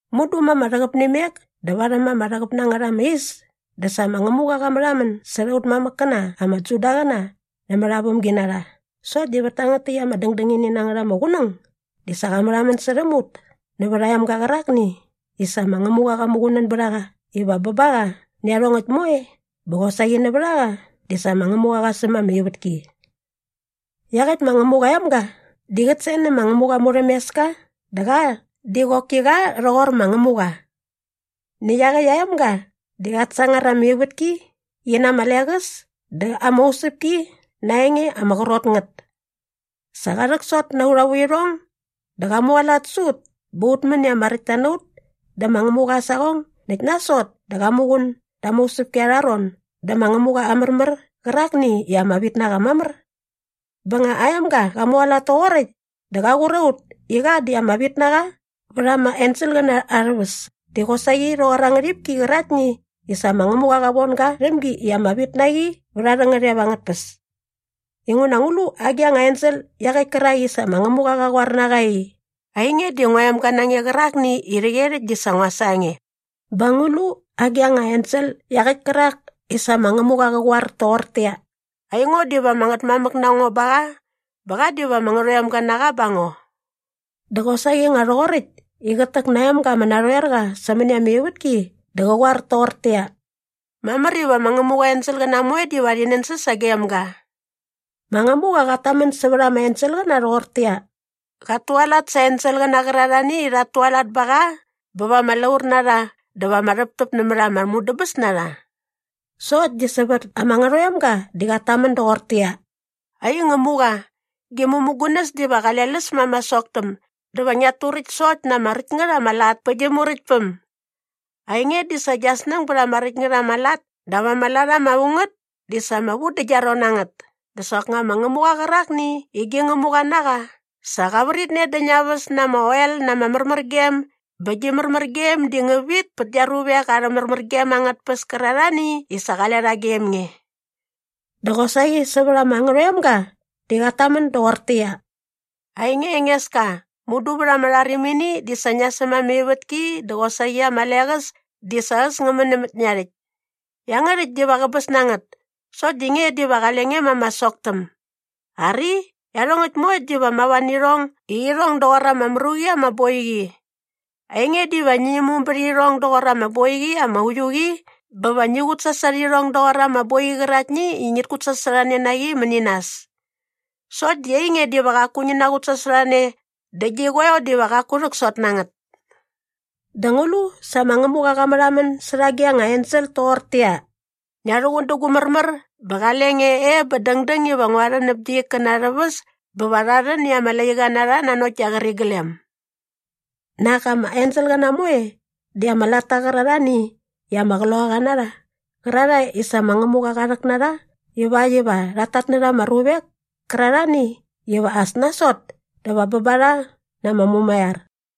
Mudu ma ama rhäqäp nä imek dä varhäm ama rhäqäp na ngät ama is dä sa ma Ngämuqa qa märhamän särha aut mamäkkäna ama Judaqäna nämät aa vämginarha sokt di vät tangät täkt ama dängdängini na ngät ama qunäng di sa qa märhamän särhäm ut nävät aa emga qärakni i sa ma Ngämuqa qa muqunän bät a qa iva bä ba qa nä iarhongäkt moe bä qosaqi nävät a qa di sa ma Ngämuqa qa säm ama ivätki. Iaqäkt ma Ngämuqa aa emga di qät sen nä ma Ngämuqa aa murhämeska dä qa di qoki qa rhoqor ma Ngämuqa. Näkt iaqäkt aa emga di qat sangar ama ivätki qi na ama leqäs dä ama usäpki na aa enge ama qrot ngät. Sa qa rhäksot na aurha vuirhong dä qa mualat sä ut bä ut män i ama räktta na ut dä ma Ngämuqa aa saqong näkt nasot dä qa muqun da ama usäpki arha ron dä ma Ngämuqa aa märmär qärakni i ama vit na qa mamär. Bä nga aa emga qa mualat toqoräkt dä qa qur a ut i qa di ama vit na qa vät ama enselqäna arhä väs di qosaqi rhoqor aa ngärhipki qäraktni i sa ma Ngämuqa qa von ga rhäm gi i ama vit na qi vät arhä ngärhep angät tpäs. Inguna ngu lu agi anga ensel iaqäkt kärak i sa ma Ngämuqa qa qoar na qa i, “Ainge di ngua emga na nge qärakni i rhäqyerhäkt di sa ngua sa nge?” bä ngu lu agi anga ensel iaqäkt kärak i sa ma Ngämuqa qa qoar toqortäqyia, “Aingo diva ama ngätmamäk na ngo ba qa bä qa diva ama ngärhoemga na qa ba ngo?” Dä qosaqi nga rhoqoräkt i qät täk na aa emga ama narhoer qa sämäni ama ivätki dä qa qoar toqortäqyia, “Mamär iva ma Ngämuqa aa enselqäna moe diva rhi nänsäs sagem ga.” Ma Ngämuqa qat tamän sävät ama enselqäna rhoqortäqyia, “Qat tualat sa aa enselqäna qärarhani i rhat tualat ba qa bä va ama laur na rha dä va ama rhäptäp nämät ama mudäbäs na rha.” Sokt di sävät ama Ngärhoemga di qat tamän doqortäqyia, “Ai Ngämuqa, gi mämugunäs diva qale läs ma ama soktäm dä va ngiat turäkt sokt na ama räkt ngät ama lat pä gi Muräktpäm. Ainge di sa gia snäng bät ama räkt ngät ama lat dap ama lat ama vu ngät di sa ama vu dä gia ron na ngät dä soknga ma Ngämuqa qärakni i gi Ngämuqa na qa sa qa vritne dä ngia väs na ama oel na ama märmärgem bä gi märmärgem di ngä vit pät gia ruavek arhä märmärgem angät tpäs kärarhani i sa qale rha gem nge.” Dä qosaqi sävät ama Ngärhoemga di qat tamän doqortäqyia, “Ainge Engeska, mudu vät ama rharimini di sa ngia säm ama ivätki dä qosaqi ama leqäs di sa äs ngä män nämät ngia rhäkt. Iangärhäkt diva qäbäs na ngät. Sokt di nge diva qale nge ma ama soktäm. Ari, iarhongäkt moekt diva mava nä irhong i irhong doqor ama mru qi ama boiqi. Ainge diva ngi imum bät irhong doqor ama boiqi ama uiu qi bä va ngi qutsasot irhong doqor ama boiqi qäraktni i ngit kutsasorhane na qi mäni nas. Sokt di ainge diva qaku ngi naqutsasorhane dä gi qoeo diva qaku rhäksot na ngät.” Dä ngu lu sa ma Ngämuqa qa märhamän särha agi anga ensel toqortäqyia, “Ngia rhuqun dä gu märmär bä qale nge e bä dängdäng iva ngua rhän näp gia ikkäna arhä väs bä va rha rhän i ama laiqa na rha nanokt gia qäriglem”? Nak ama enselqäna moe di ama latta qärarhani i ama qloqaqa na rha qärarhae i sa ma Ngämuqa qa rhäk na rha ivakt iva rhat tatnärha ama ruvek kärarhani iva as nasot dä va bä ba rha na ama mumaiar.